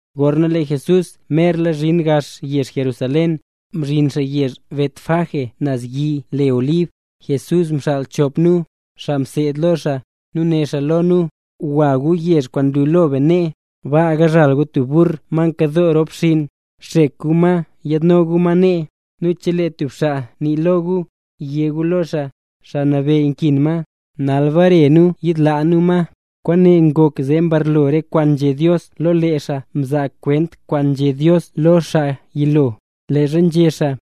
Gorna lee Jesús merla mzhin gax yezh Jerusalén, mzhin xaa yezh Betfagé naz yi le Olib, Jesús mxaal chop nu, xaa mseed lo xaa, nu né xaa lo nu: —Gwa gu yezh kwaan nlu lo be nee. Baa yizhal gu tub burr ma nkadoo rop xinn. Xek gu ma nu yaadno gu ma nee. Nu chelee tub xaa nii lo gu, yé gu lo xaa: “Xaa Nabeyy nkin ma, nal bare nu yiidlaa nu ma”. Kwaane ngok zee mbarlo re kwaan nzhé Dios lo xaa mzaa kwent kwaan nzhé Dios lo lee xaa yilo, leezha nzhé xaa: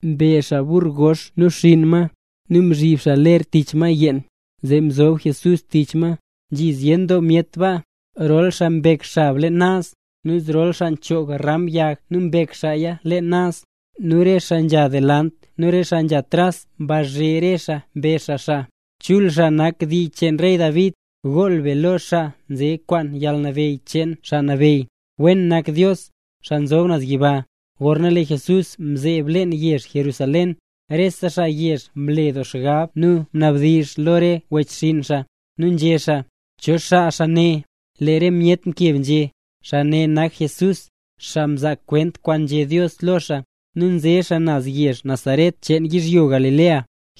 Mbe xaa burr gox nu xinn ma, nu mzhib xaa ler tich ma yeen, zee mzob Jesús tich ma. Nzhi zyen doo myet baa, rol xaa mbek xab leen naz, nu zrol xaa mchoog ram yag nu mbek xaaya leen naz. Nu re xaa nzha delant nu re xaa nzeke tras mbazhe re xaa, mbezh xaa: —¡Chul xaa nak nze dii cheen rey David! ¡Gool be lo xaa nze kwaan yalnabeyy cheen Xaa Nabeyy! ¡Wen nak Dios, xaa nzob naz yiba! Gorna lee Jesús mzeeb leen yezh Jerusalén, rese xaa yezh mle doo xgab nu mnabdizh lo re wechxinn xaa, nu nzhé xaa: —¿Cho xaa xaa ne? Lee re myet mkeb nzhé: —Xaa ne nak Jesús, xaa nzaa kwent kwaan nzhé Dios lo xaa, nu nze xaa yezh Nazaret cheen yizhyo Galilea.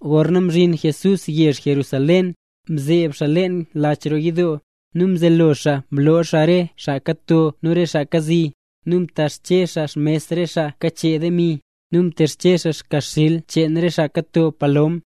Gorna mzhin Jesús yezh Jerusalén, mzeeb xaa leen lach roo yidoo, nu mzelo xaa mloo xaa re xaa kato nu re xaa kazi. Nu mtexche xaa xmes re xaa kachee demi, nu mtexche xaa yagxil cheen re xaa kato palom.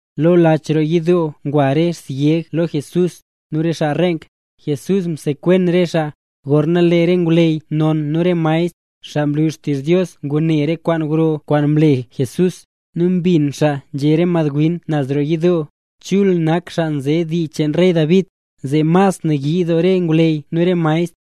Lo lach roo yidoo ngwa re syeg lo Jesús, nu re xaa reenk, Jesús msekwen re xaa. Gorna lee re ngwleyy non nu re maestr, xaa nlu xtizh Dios ngune re kwaan gro kwaan mle Jesús, nu mbin xaa nzhé re madwin naz roo yidoo: “¡Chul nak xaa nze dii cheen rey David!”, zee mas nayii doo re ngwleyy nu re maestr.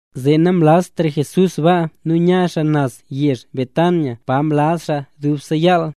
Zee namlaztra Jesús baa nu nya xaa naz yezh Betania pa mlaz xaa dubse yaal.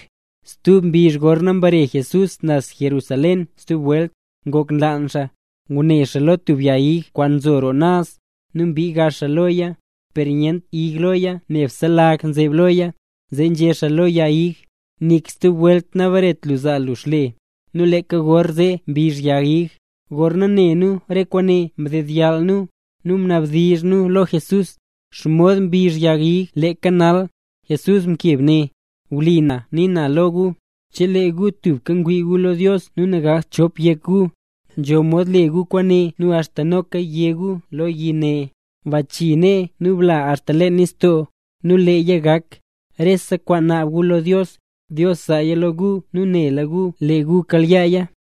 Stub mbizh gorna mbare Jesús naz Jerusalén stub welt, ngok nlaan xaa. Ngune xaa lo tub yag ig kwaan nzo roo naz, nu mbii xaa gax loya, per nyent ig loya nebse lag nzeb loya. Zee nzhé xaa lo yag ig: —Nik stub welt nabaretra lu zaa lu xle. Nu leeka gorzee mbizh yag ig. Gorna ne nu re kwaane mdedyall nu, nu mnabdizh nu lo Jesús: —¿Xomod mbizh yag ig leeka nal? Jesús mkeb né: —Wlipa na kwaan nii na lo gu, chelee gu tubka ngwii gu lo Dios nu nagakt chop yek gu, nzho mod le gu kwaane nu axta noka yé gu lo yi ne: “Bachii nee nu bla axta leen nistoo”, nu leeya gak. Rese kwaan naab gu lo Dios, Dios zaaya lo gu nu nela gu lee gu kayaaya.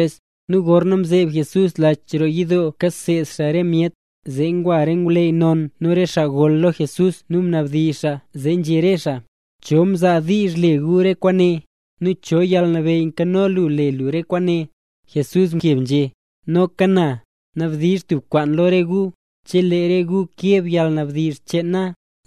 Nu gorna mzeeb Jesús lach roo yidoo kaseed xaa re myet, zee ngwa re ngwleyy non nu re xaa gol lo Jesús nu mnabdizh xaa, zee nzhé re xaa: —¿Cho mzaa diizh le lu re kwaane? ¿Nu cho yalnabeyy nkano lu le lu re kwaane? Jesús mkeb nzhé: —Noka na, nabdizh tub kwaan lo re gu. Chelee re gu keb yalnabdizh cheen na,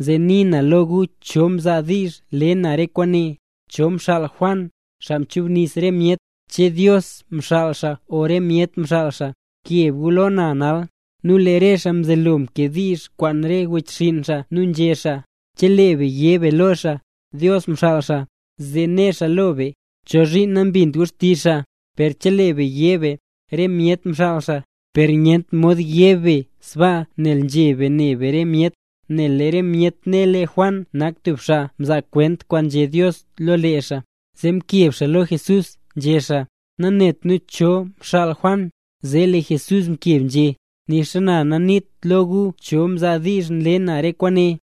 zee nii na lo gu cho mzaa diizh le na re kwaane. ¿Cho mxaal Juan, xaa mchubnis re myet? ¿Che Dios mxaal xaa o re myet mxaal xaa? ¡Keb gu lo na nal! Nu lee re xaa mzelo mkediizh kwaan re wechxinn xaa nu nzhé xaa: —Chelee be yé be lo xaa: “Dios mxaal xaa”, zee né xaa lo be: “¿Chozhiin nambint gu xtizh xaa?” Per chelee be yé be: “Re myet mxaal xaa…”, per nyent mod yé be sbaa nel nzheb be ne be re myet, nel lee re myet ne lee Juan nak tub xaa mzaa kwent kwaan nzhé Dios lo lee xaa. Zee mkeb xaa lo Jesús nzhé xaa: —Nanet nu cho xaa mxaal Juan. Zee lee Jesús mkeb nzhé: —Nixa na naniit lo gu cho mzaa diizh nle na re kwaane.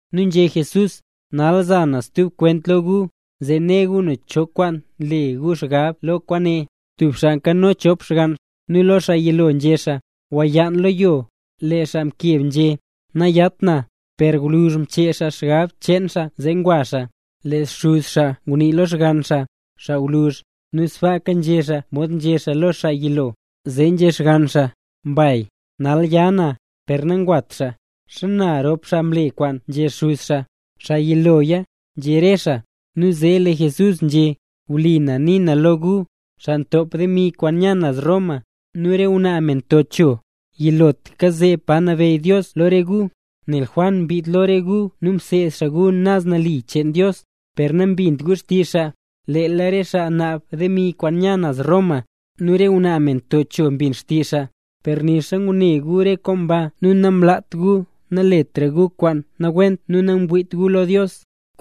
Nu nzhé Jesús: —Nal za na stub kwent lo gu, zee ne gu cho kwaan nle gu xgab lo kwaane. Tub xaa nkano chop xgann, nu lo xaa yilo nzhé xaa: “Gwayaan lo yo”. Lee xaa mkeb nzhé: “Nayat na”. Per gwluzh mchee xaa xgab cheen xaa zee ngwa xaa. Lee xuz xaa ngunii lo xgann xaa, xaa gwluzh, nu sbaaka nzhé xaa mod nzhé xaa lo xaa yilo. Zee nzhé xgann xaa: “Mbay, nal ya na”. Per nangwat xaa. ¿Xana rop xaa mle kwaan nzhé xuz xaa? —Xaa yiloya —nzhé re xaa. Nu zee lee Jesús nzhé: —Wlipa na nii na lo gu, xaa ntop demi kwaan nya naz Roma, nu re ngwnaa me nto cho, yilotlaka zeeb pa nabeyy Dios lo re gu. Nel Juan mbiid lo re gu nu mseed xaa gu naz nali cheen Dios, per nambint gu xtizh xaa; leel re xaa naab demi kwaan nya naz Roma, nu re ngwnaa me nto cho mbin xtizh xaa. Per nixa ngune gu re kwaan ba nu nanglaat gu naletra gu kwaan nawent nu nangwiit gu lo Dios.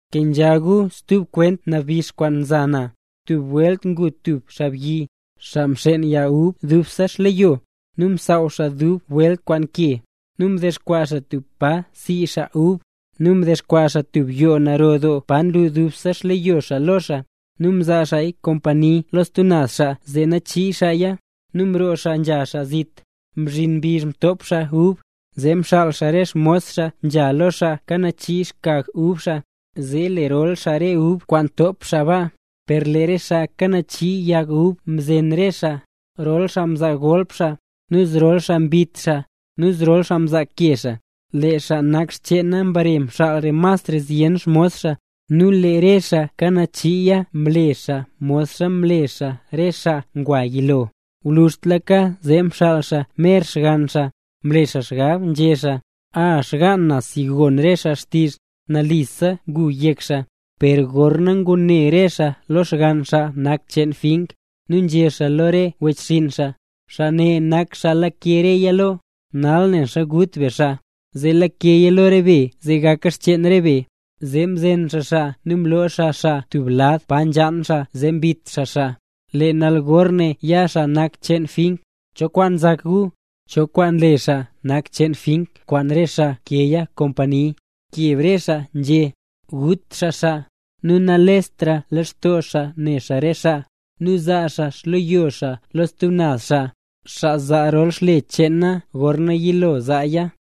’Kenzha gu stub kwent nabix kwaan za na: Tub welt ngu tub xaabyi, xaa mxeen yag ub dubse xleyo. Nu msaaw xaa dub welta kwaan ke. Nu mdexkwaa xaa tub pa sii xaa ub, nu mdexkwaa xaa tub yoo naro doo pa nlu dubse xleyo xaa lo xaa. Nu mzaa xaaya kompani lo stub xaa zee nachii xaaya, nu mroo xaa nzha xaa zit. Mzhin mbizh top xaa ub, zee mxaal xaa re xmos xaa nzha lo xaa kanachii xkag ub xaa, zee lerol xaa re ub kwaan top xaa ba. Per lee re xaa kanachii yag ub mzen re xaa, rol xaa mzaa golp xaa, nu zrol xaa mbit xaa, nu zrol xaa mzaake xaa. Lee xaa nak cheena mbare mxaal xaa masra zyen xmos xaa, nu lee re xaa kanachiiya mle xaa modxa mle xaa re xaa ngwa yilo. ’Gwluzhtlaka zee mxaal xaa mer xgann xaa, mle xaa xgab nzhé xaa: “A, xgaan na si gon re xaa xtizh. Nalisa ngu yek xaa.” Per gorna ngune re xaa lo xgann xaa nak cheen fink, nu nzhé xaa lo re wechxinn xaa: “Xaa ne nak xaa lake reya lo. Nal ne xa gut be xaa, zee lakeya lo re be zee gaka xcheen be.” Zee mzen xaa xaa nu mloo xaa xaa tub lad pa nzhaan xaa zee mbit xaa xaa. ’Lee nal gorna ya xaa nak cheen fink, ¿cho kwaan nzak gu? ¿Cho kwaan le xaa nak cheen fink kwaan re xaa mkeeya kompani? Mkeb re xaa nzhé: —Gut xaa xaa, nu nalestra lextoo xaa ne xaa re xaa, nu zaa xaa xleyo xaa lo stub naz xaa, xaa zaa rol xle cheena gorna yilo zaaya.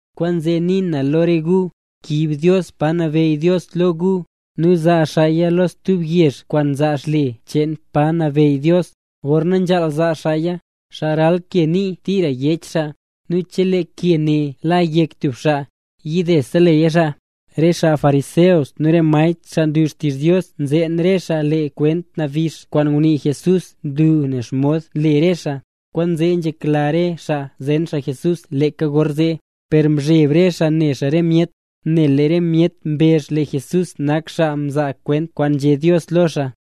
Kwaanzee nii na lo re gu: Kiib Dios pa nabeyy Dios lo gu, nu zaa xaaya lo stub yezh kwaan zaa xle cheen pa nabeyy Dios, gorna nzhaal zaa xaaya. Xaa ral ke ne nii tira yech xaa; nu chelee ke ne la yek tub xaa, yidese leya xaa. Re xaa fariseo nu re maestr xaa nlu xtizh Dios mzeen re xaa lee kwent nabix kwaan ngunii Jesús nlu nen xomod nle re xaa. Kwaanzee nzhekla re xaa zen Jesús leeka gorzee, per nzheb re xaa ne re myet, nel lee re myet mbezh lee Jesús nak xaa nzaa kwent kwaan nzhé Dios lo xaa.